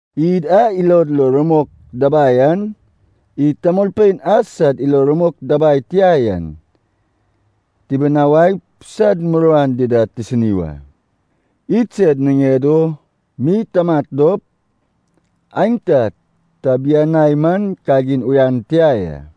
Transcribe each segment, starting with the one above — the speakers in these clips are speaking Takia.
Id a ilod lo rumok dabai an, id tamolpein a sad ilo rumok dabai tia yan tibinawaip sad muruan dida tisini wa. Idsed niŋed o mi tamat dop aenta tabianai man kagin uyan tia ya.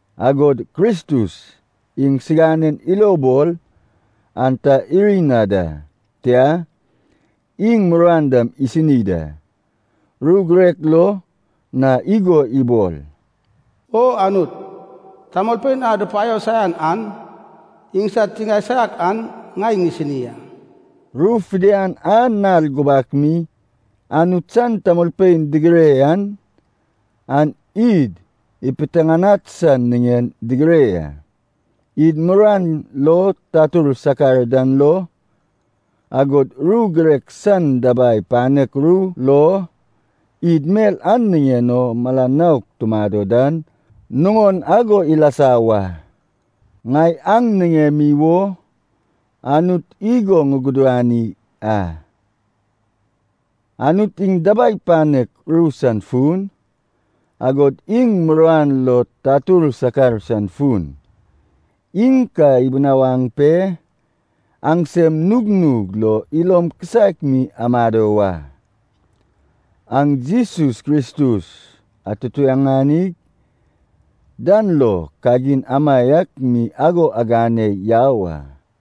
Agod Kristus iŋsinanen ilo ibol an ta iri na da. Tia, iŋ muruan dam isini da. Ru girek lo na igo ibol, “O Anut, tamolpein a dupaio saian an iŋsad tiŋae saiak an ŋai ŋisini a.” Ru fidian a nal gubak mi Anut san tamolpein digire yan, an id ipiteŋanad san niŋen digire ya. Id muruan lo tatur sakar dan lo, agod ru girek san dabai panek ru lo, id mel a niŋen o mala nouk tumado dan nuŋon ago ilasa wa. Ŋai aŋ niŋemi wo Anut igo ŋugudani a. Anut iŋ dabai panek ru san fun, agod iŋ muruan lo tatur sakar san fun, iŋ ka ibinawaŋ pe aŋsem nugnug lo ilom kisaek mi amado wa. Aŋ Jesus Kristus atutuŋani dan lo kagin amaiak mi ago agane yau a.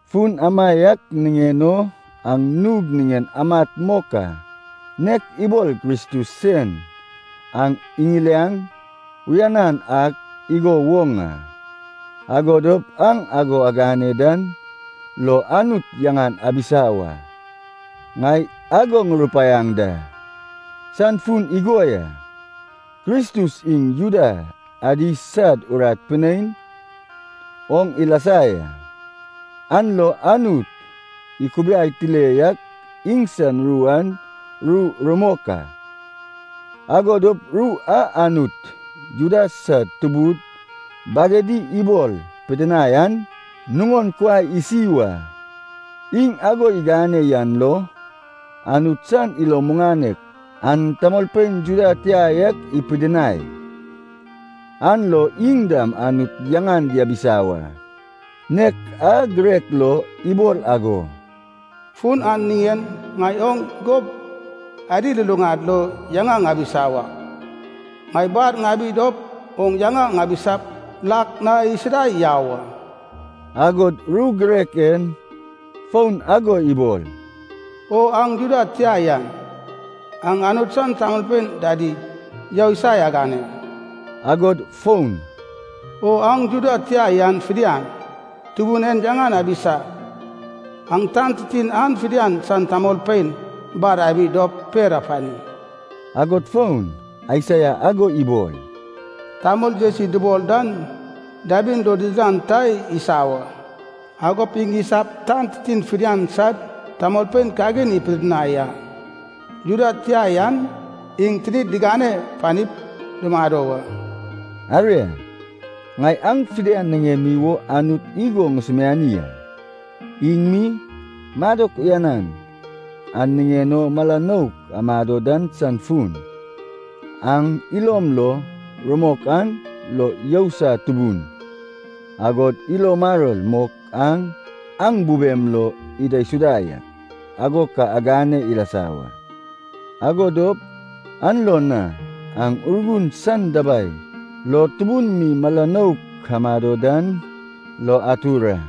Fun amaiak niŋen o aŋ nug niŋen amat mok a, nek ibol Kristus sen aŋ iŋiliaŋ uyanan ak igo woŋ a. Ago dop aŋ ago agane dan lo Anut yaŋan abisa wa. Ŋai ago ŋurupaiaŋ dan san fun igo ya. Kristus iŋ Juda adi sad urat pinein oŋ ilasa ya, an lo Anut ikubiai tile yak iŋsan ru an ru rumok a. Ago dop ru a Anut Juda sad tubud bagedi ibol ipidinai an nuŋon kuai isi wa. Iŋ ago igane yan lo Anut san ilo muŋanek an tamolpein Juda tia yak ipidinai, an lo iŋ dam Anut yaŋan diabisa wa. Nek a girek lo ibol ago, “Fun an niŋen ŋai oŋ gob adi luluŋad lo yaŋa ŋabisa wak, ŋai bar ŋabi dop oŋ yaŋa ŋabisap lak na isida yau a.” Agod ru girek en fon ago ibol, “O aŋ Juda tia yan, aŋ Anut san tamolpein dadi yousai agane.” Agod fon, “O aŋ Juda tia yan fidian, Tubun en yaŋan abisa, aŋ tan titin an fidian san tamolpein bar abi dop per apani.” Agod fon, Aisaia ago ibol, “Tamol Jesi dubol dan dabin lo didilan ta isa wa, agop iŋ isap tan titin fidian sad tamolpein kagin ipidinai a. Juda tia yan iŋ tinid digane panip dumado wa.” Aria, ŋai aŋ fidian niŋemi wo Anut igo ŋusumiani a. Iŋ mi, madok uyanan a niŋen o mala nouk amado dan san fun, aŋ ilom lo rumok an lo yousai tubun, agod ilo maror mok an aŋ bubem lo idaisuda yak, ago ka igane ilasa wa. Ago dop an lo na aŋ Urgun san dabai lo tubun mi mala nouk amado dan lo atur a.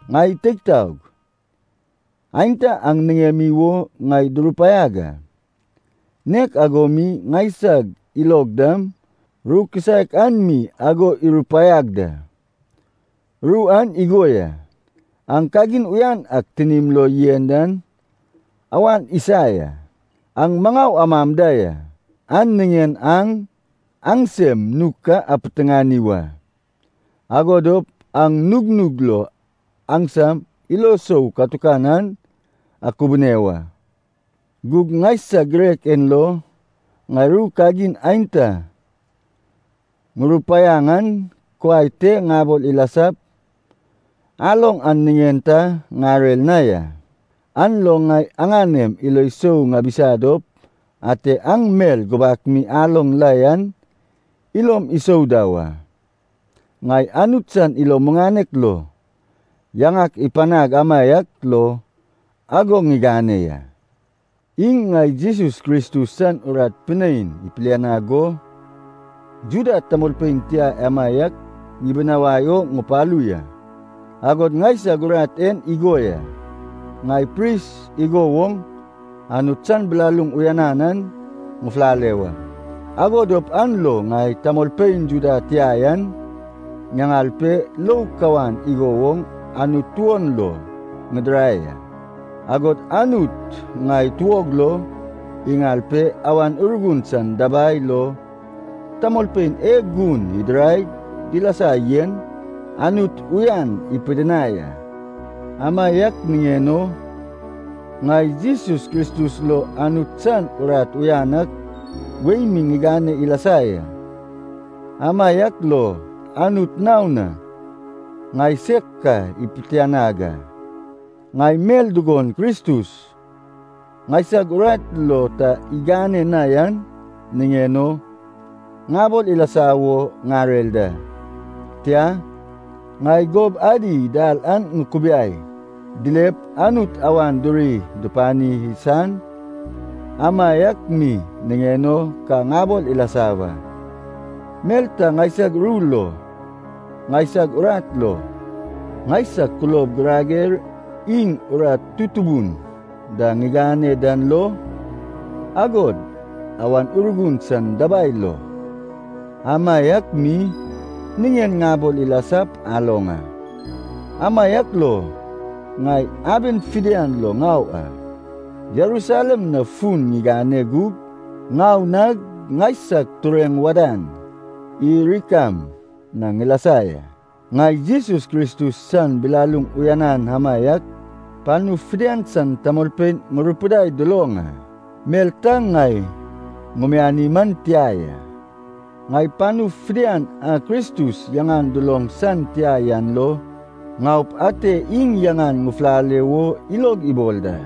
Ŋai teig taog, aenta aŋ niŋemi wo ŋai durupaiag a, nek ago mi ŋaisag ilog dam ru kisaek an mi ago irupaiag da. Ru an igo ya. Aŋ kagin uyan ak tinim lo yen an awan isa ya. Aŋ maŋau amam da ya, an niŋen aŋ aŋsem nug ka apiteŋani wa, ago dop aŋ nugnug lo aŋsam ilo sou katukan an akubune wa. Gug ŋaisag girek en lo, ŋai ru kagin aenta ŋurupaiaŋ an kuai te ŋabol ilasap aloŋ an niŋen ta ŋarer na ya. An lo ŋai aŋanem ilo sou ŋabisa dop ate aŋ mel gubak mi aloŋ la yan ilom isou da wa. Ŋai Anut san ilo muŋanek lo yaŋak ipanag amaiak lo ago ŋigane ya. Iŋ ŋai Jesus Kristus san urat pinein ipilianag go Juda tamolpein tia amaiak ŋibinawai o ŋupalu ya. Agod ŋaisag urat en igo ya, ŋai pris igo woŋ Anut san bilaluŋ uyanan an ŋufulale wa, ago dop an lo ŋai tamolpein Juda tia yan ŋaŋal pe lou kawan igo woŋ Anut tuon lo ŋidirai a. Agod Anut ŋai tuog lo iŋal pe Awan Urgun san dabai lo tamolpein e gun idiraig dilasa yen Anut uyan ipidinai a. Amaiak niŋen o, ŋai Jesus Kristus lo Anut san urat uyan ak wei mi ŋigane ilasa ya. Amaiak lo Anut naon na ŋaiseg ka ipitianag a. Ŋai mel dugon Kristus ŋaisag urat lo ta igane na yan niŋen o ŋabol ilasa wo ŋarer da. Tia, ŋai gob adi dal an ŋukubiai dilep Anut awan duri dupani san amaiak mi niŋen o ka ŋabol ilasa wa. Mel ta ŋaisag ru lo, ŋaisag urat lo, ŋaisag kulob girager iŋ urat tutubun da ŋigane dan lo, agod Awan Urgun san dabai lo, amaiak mi niŋen ŋabol ilasap aloŋ a. Amaiak lo ŋai aben fidian lo ŋau a, Jerusalem na fun ŋigane gug ŋau nag ŋaisag tureŋ wadan Ilirikam na ŋilasa ya. Ŋai Jesus Kristus san bilaluŋ uyanan amaiak panu fidian san tamolpein ŋurupidai duloŋ a, mel ta ŋai ŋumiani man tia ya. Ŋai panu fidian a Kristus yaŋan duloŋ san tia yan lo ŋaup ate iŋ yaŋan ŋufulale wo ilog ibol da.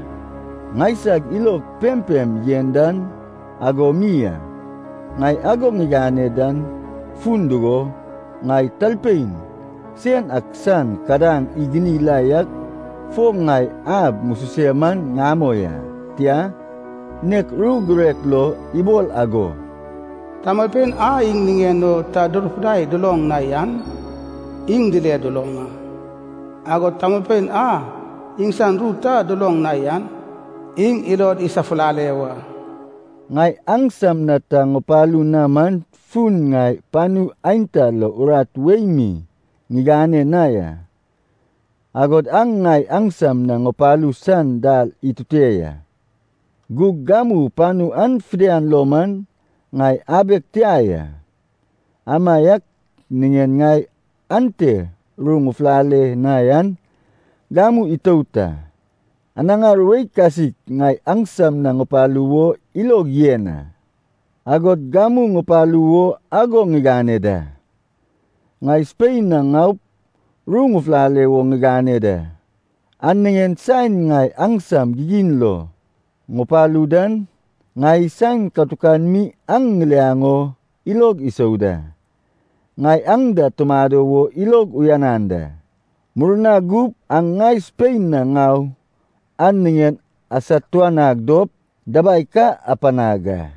Ŋaiseg ilog pempem yen dan ago mi a. Ŋai ago ŋigane dan fun dugo, ŋai talpein sen ak san kadaŋ iguni la yak fo na ab ŋususe man ŋamoi a. Tia, nek ru girek lo ibol ago, “Tamolpein a iŋ niŋen o ta durupidai duloŋ na yan iŋ dile duloŋ a. Agod tamolpein a iŋsan ru ta duloŋ na yan, iŋ ilod isafulale wa.” Ŋai aŋsam na ta ŋupalu na man fun ŋai panu aenta lo urat wei mi ŋigane na ya, agod an ŋai aŋsam na ŋupalu san dal itute ya. Gug gamu panu an fidian lo man ŋai abeg tia ya, amaiak niŋen ŋai ante ru ŋufulale na yan gamu itout a. Anaŋar wei kasik ŋai aŋsam na ŋupalu wo ilog yen a, agod gamu ŋupalu wo ago ŋigane da. Ŋai Spein na ŋaup ru ŋufulale wo ŋigane da. An niŋen saen ŋai aŋsam gigin lo ŋupalu dan, ŋai saen katukan mi aŋ ŋiliaŋ o ilog isou da. Ŋai aŋ da tumado wo ilog uyanan da, murna gup aŋ ŋai Spein na ŋau an niŋen asatuanag dop dabai ka apanag a.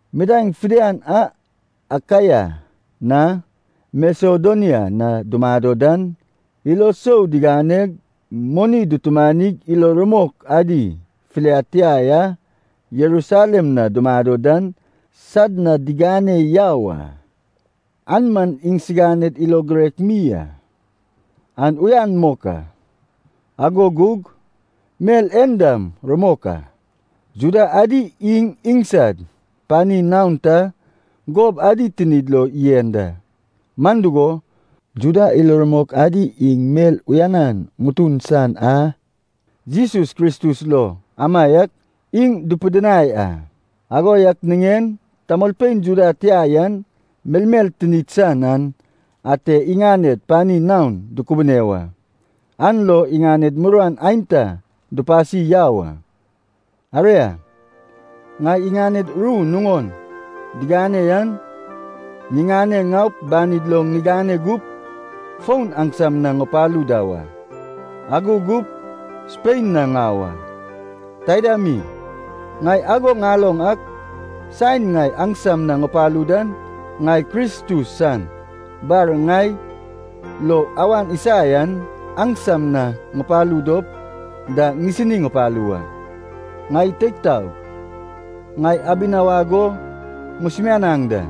Midaeŋ fidian a Akaia na Masedonia na dumado dan ilo sou diganeg, moni dutumanig ilo rumok adi filiad tia a Jerusalem na dumado dan sad na digane yau a. An man iŋsiganed ilo girek mi a. An uyan mok a, ago gug mel en dam rumok a, Juda adi iŋ iŋsad pani naon ta gob adi tinid lo yen da. Man dugo, Juda ilo rumok adi iŋ mel uyanan ŋutun san a Jesus Kristus lo amaiak iŋ dupidinai a. Ago yak niŋen tamolpein Juda tia yan melmel tinid san an ate iŋaned pani naon dukubune wa, an lo iŋaned muruan aenta dupasi yau a. Aria, ŋai iŋaned ru nuŋon digane yan ŋiŋane ŋaup banid lo ŋigane gup fon aŋsam na ŋupalu da wa, ago gup Spein na ŋau a. Taida mi, ŋai ago ŋaloŋ ak saen ŋai aŋsam na ŋupalu dan, ŋai Kristus san bar ŋai lo awan isa yan aŋsam na ŋupalu dop da ŋisini ŋupalu wa. Ŋai teig taog, ŋai abinawag o ŋusumianaŋ da.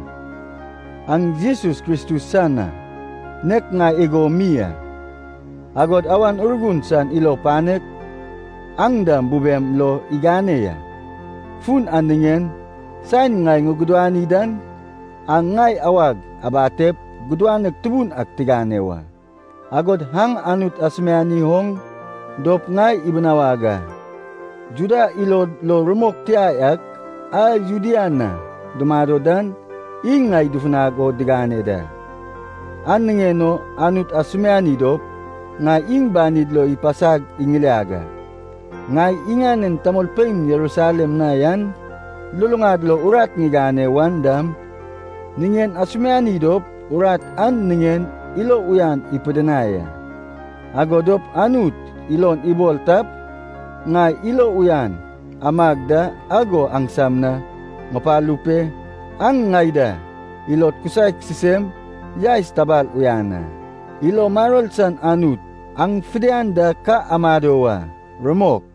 Aŋ Jesus Kristus san a, nek ŋai igo mi a, agod Awan Urgun san ilo panek aŋ dam bubem lo igane ya. Fun an niŋen, saen ŋai ŋugudani dan aŋ ŋai awag abatep gudanek tubun ak tigane wa. Agod aŋ Anut asumiani oŋ dop ŋai ibinawag a. Juda ilod lo rumok tia yak a Judea na dumado dan iŋ ŋai dufunag o digane da. An niŋen o Anut asumiani dop ŋai iŋ banid lo ipasag iŋiliag a. Ŋai iŋanen tamolpein Jerusalem na yan luluŋad lo urat ŋigane wan dam niŋen asumiani dop urat an niŋen ilo uyan ipidinai a. Ago dop Anut ilon ibol tap, ŋai ilo uyan amag da ago aŋsam na ŋupalu pe aŋ ŋai da ilod kisaek sisem yaes tabal uyan a. Ilo maror san Anut aŋ fidian da ka amado wa. Rumok.